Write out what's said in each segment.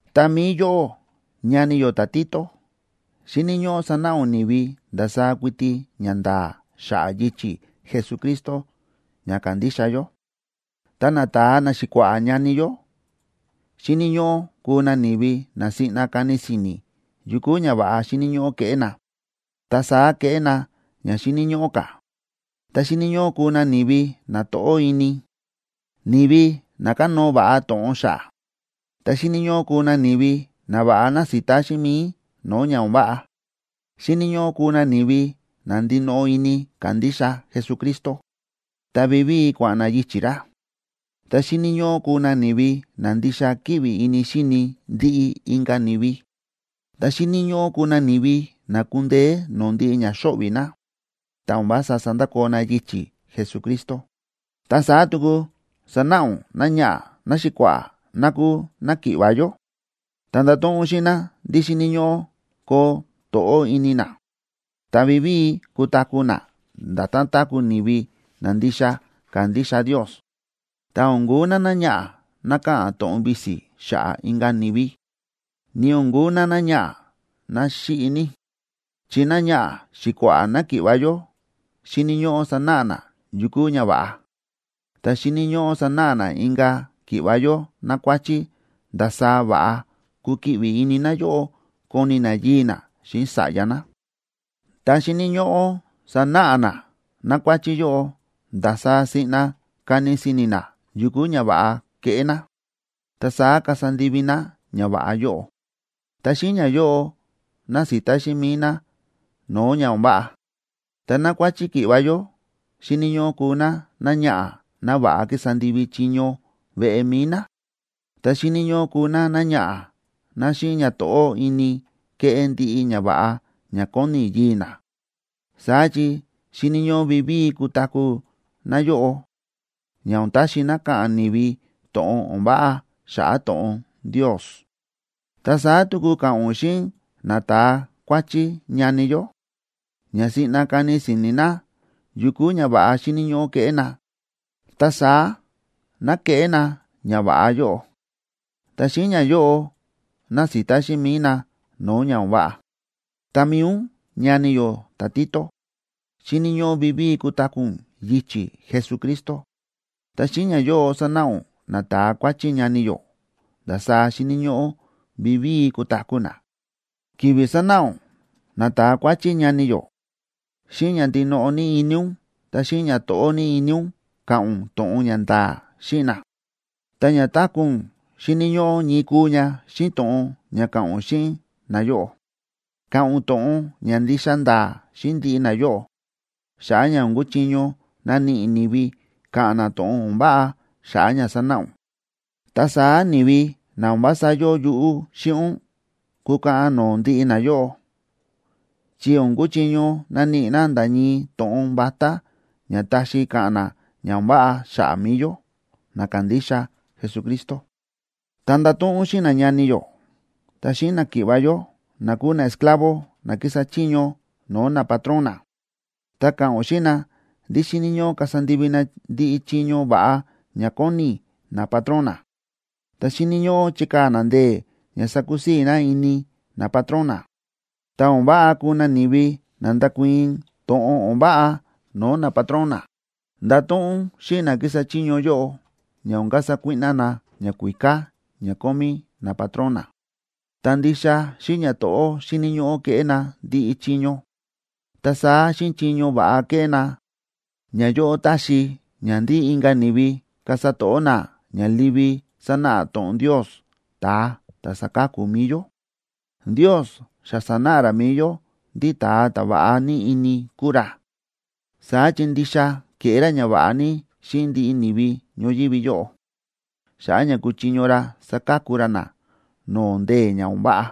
Ta mi̱i yóꞌó, ñani yó ta̱Tito, xíni̱ ñóꞌó sanáꞌa ún ni̱vi ndasaá kuiti ñanda̱a̱ xa̱ꞌa̱ yichi̱ Jesucristo ña kándixa yó. Ta nata̱a naxi̱kua̱ꞌa̱ ñani yó xíni̱ ñóꞌó kuu na ni̱vi na siꞌna kani si̱ni̱ yu kúu ñava̱ꞌa xíni̱ ñóꞌó keꞌé na, ta saá kéꞌé na ña xíni̱ ñóꞌó ka̱. Ta xíni̱ ñóꞌó kuu na ni̱vi na to̱ꞌó ini, ni̱vi na kánóo va̱ꞌa to̱ꞌon xa̱ꞌa̱. Ta xíni̱ ñóꞌó kuu na ni̱vi na va̱ꞌa násita xíꞌin mi̱i no̱o̱ ña o̱n váꞌa. Xíni̱ ñóꞌó kuu na ni̱vi na ndinoꞌo ini kándixa Jesucristo, ta vivíi kua̱ꞌa̱n na yichi̱ ra. Ta xíni̱ ñóꞌó kuu na ni̱vi na ndixa kíꞌvi ini xíni ndiꞌi inka̱ ni̱vi, ta xíni̱ ñóꞌó kuu na ni̱vi na kúndeé no̱o̱ ndiꞌi ña xóꞌvi̱ na, ta o̱n vása sándakoo na yichi̱ Jesucristo. Ta saá tuku sanáꞌa ún náñaꞌa̱ náxi̱kua̱ꞌa̱ ná kúu náki̱ꞌva̱ yó. Ta ndato̱ꞌon ún xíꞌin ná ndí xíni̱ ñóꞌó koo to̱ꞌó ini ná, ta vivíi kutaku̱ ná nda̱tán táku̱ ni̱vi na ndixa kándixa Ndios, ta o̱n kuu ná náñaꞌa̱ ná káꞌa̱n to̱ꞌon visi xa̱ꞌa̱ inka̱ ni̱vi, ni o̱n kuu ná náñaꞌa̱ ná xíꞌi ní. Chi náñaꞌa̱ xi̱kua̱ꞌa̱ náki̱ꞌva̱ yó xíni̱ ñóꞌó sanáꞌa ná yu kúu ña va̱ꞌa. Ta xíni̱ ñóꞌó sanáꞌa ná inka̱ ki̱ꞌva̱ yó nákuáchí ndasaá va̱ꞌa kukiꞌvi ini náyóꞌo koni ná yii̱ ná xíꞌin sa̱ꞌya ná. Ta xíni̱ ñóꞌó sanáꞌa ná nákuáchí yóꞌo ndasaá siꞌna kani si̱ni̱ ná yu kúu ña va̱ꞌa keꞌé ná, ta saá kasa ndivi ná ñava̱ꞌa yóꞌo, ta xíꞌin ñayóꞌo nasita xíꞌin mi̱i ná no̱o̱ ña o̱n váꞌa. Ta nákuáchí ki̱ꞌva̱ yó xíni̱ ñóꞌó kuu ná náñaꞌa̱ ná va̱ꞌa kísa ndivi chiño veꞌe mi̱i ná, ta xíni̱ ñóꞌó kuu ná náñaꞌa̱ ná xíꞌin ñato̱ꞌó ini kéꞌé ndiꞌi ñava̱ꞌa ña kóni yii̱ ná. Saá chi xíni̱ ñóꞌó vivíi kutaku̱ náyóꞌo, ña o̱n taxi ná ka̱ꞌa̱n ni̱vi to̱ꞌon o̱n váꞌa xa̱ꞌa̱ to̱ꞌon Ndios. Ta saá tuku ka̱ꞌa̱n ún xíꞌin nata̱a kuáchí ñani yó, ña siꞌna kani si̱ni̱ na yu kúu ñava̱ꞌa xíni̱ ñóꞌó keꞌé na, ta saá ná keꞌé na ñava̱ꞌa yóꞌo, ta xíꞌin ñayóꞌo nasita xíꞌin mi̱i na no̱o̱ ña o̱n váꞌa. Ta mi̱i ún, ñani yó ta̱Tito, xíni̱ ñóꞌó vivíi kutaku̱ ún yichi̱ Jesucristo, ta xíꞌin ñayóꞌo sanáꞌa ún nata̱a kuáchí ñani yó ndasaá xíni̱ ñóꞌó vivíi kutaku̱ na. Ki̱vi̱ sánáꞌa ún nata̱a kuáchí ñani yó, xíꞌin ña ndinoꞌo ní ini ún ta xíꞌin ñato̱ꞌó ní ini ún ka̱ꞌa̱n ún to̱ꞌon ña nda̱a̱ xíꞌin na, ta ña táku̱ ún xíni̱ ñóꞌó ñii kuu ña xíꞌin to̱ꞌon ña káꞌa̱n ún xíꞌin nayóꞌo. Ka̱ꞌa̱n ún to̱ꞌon ña ndixa nda̱a̱ xíꞌin ndiꞌi nayóꞌo, xa̱ꞌa̱ ña o̱n kuchiño naníꞌi ni̱vi ka̱ꞌa̱n na to̱ꞌon o̱n váꞌa xa̱ꞌa̱ ña sánáꞌa ún. Ta saá ni̱vi na o̱n vása yóo yuꞌú xíꞌin ún, kukaꞌan no̱o̱ ndiꞌi nayóꞌo, chi o̱n kuchiño naníꞌi na nda̱ ñii to̱ꞌon vatá ña taxi ka̱ꞌa̱n na ña o̱n váꞌa xa̱ꞌa̱ mi̱i yó, na kándixa Jesucristo. Ta ndato̱ꞌon ún xíꞌin nañani yó ta xíꞌin náki̱ꞌva̱ yó na kúu naesclavo na kísa chiño no̱o̱ napatrón na, ta ka̱ꞌa̱n ún xíꞌin na ndí xíni̱ ñóꞌó kasa ndivi na ndiꞌi chiño va̱ꞌa ña kóni napatrón na, ta xíni̱ ñóꞌó chikaa̱ na ndee̱ ña sakusii̱ na ini napatrón na. Ta o̱n váꞌa kuu na ni̱vi na ndákuii̱n to̱ꞌon o̱n váꞌa no̱o̱ napatrón na. Ndato̱ꞌon ún xíꞌin na kísa chiño yóꞌo ña o̱n kasa kuíꞌná na ñakuíká ña kómí napatrón na, ta ndixa xíꞌin ñato̱ꞌó xíni̱ ñóꞌó keꞌé na ndiꞌi chiño. Ta saá xíꞌin chiño va̱ꞌa kéꞌé na, ñayóꞌo táxi ña ndí inka̱ ni̱vi kasa to̱ꞌó na ña livi sánáꞌa to̱ꞌon Ndios, ta̱a ta̱ sáka̱ku mi̱i yó. Ndios xa sa̱náꞌa ra mi̱i yó ndí ta̱a ta̱ va̱ꞌa ní ini kúu ra. Saá chi ndixa ke̱ꞌé ra ñava̱ꞌa ní xíꞌin ndiꞌi ni̱vi ñoyívi yóꞌo xa̱ꞌa̱ ña kúchiño ra saka̱ku ra na no̱o̱ ndee̱ ña o̱n váꞌa.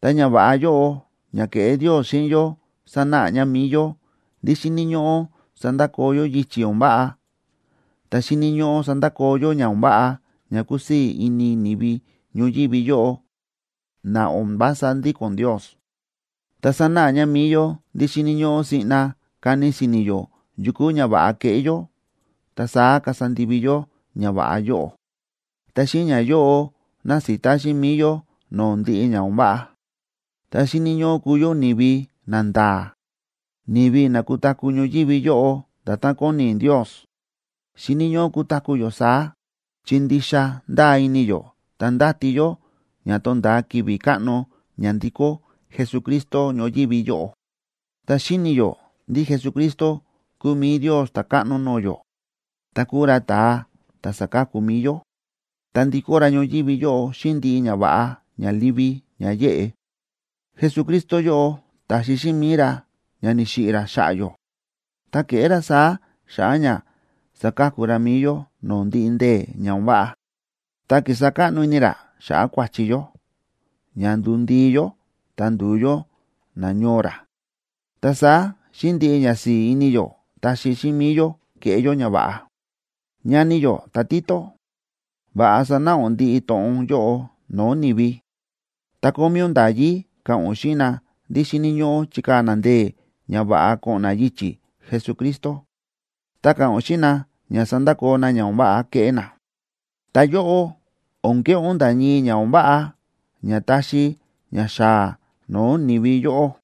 Ta ñava̱ꞌa yóꞌo ña ke̱ꞌé Ndios xíꞌin yó sánáꞌa ña mi̱i yó ndí xíni̱ ñóꞌó sandakoo yó yichi̱ o̱n váꞌa, ta xíni̱ ñóꞌó sandakoo yó ña o̱n váꞌa ña kúsii̱ ini ni̱vi ñoyívi yóꞌo na o̱n vása ndíko̱n Ndios. Ta sánáꞌa ña mi̱i yó ndí xíni̱ ñóꞌó siꞌna kani si̱ni̱ yó yu kúu ña va̱ꞌa keꞌé yó, ta saá kasa ndivi yó ñava̱ꞌa yóꞌo, ta xíꞌin ñayóꞌo nasita xíꞌin mi̱i yó no̱o̱ ndiꞌi ña o̱n váꞌa. Ta xíni̱ ñóꞌó kuu yó ni̱vi nanda̱a̱, ni̱vi na kutaku̱ ñoyívi yóꞌo nda̱tán kóni Ndios. Xíni̱ ñóꞌó kutaku̱ yó saá, chi ndixa ndáa ini yó ta ndáti yó ña tonda̱a ki̱vi̱ káꞌno ña ndikó Jesucristo ñoyívi yóꞌo. Ta xíni̱ yó ndí Jesucristo kúu mi̱i Ndios ta̱káꞌno no̱o̱ yó, ta kúu ra ta̱a ta̱ sáka̱ku mi̱i yó. Ta ndikó ra ñoyívi yóꞌo xíꞌin ndiꞌi ñava̱ꞌa ña livi ña yéꞌe. Jesucristo yóꞌo ta̱xi xíꞌin mi̱i ra ña ni̱xiꞌi̱ ra xa̱ꞌa̱ yó, ta ke̱ꞌé ra saá xa̱ꞌa̱ ña saka̱ku ra mi̱i yó no̱o̱ ndiꞌi ndee̱ ña o̱n váꞌa. Ta kísa káꞌno ini ra xa̱ꞌa̱ kua̱chi yó, ña nduu ndii yó ta nduu yó nañoo ra, ta saá xíꞌin ndiꞌi ñasi̱i̱ ini yó taxi xíꞌin mi̱i yó keꞌé yó ñava̱ꞌa. Ñani yó ta̱Tito, va̱ꞌa sanáꞌa ún ndiꞌi to̱ꞌon yóꞌo no̱o̱ ni̱vi. Ta kómí ún nda̱yí ka̱ꞌa̱n ún xíꞌin na ndí xíni̱ ñóꞌó chikaa̱ na ndee̱ ña va̱ꞌa ko̱ꞌo̱n na yichi̱ Jesucristo. Ta ka̱ꞌa̱n ún xíꞌin na ña sandakoo na ña o̱n váꞌa kéꞌé na. Ta yóꞌó, o̱n keꞌé ún nda̱ ñii ña o̱n váꞌa ña taxi ña xaa no̱o̱ ni̱vi yóꞌó.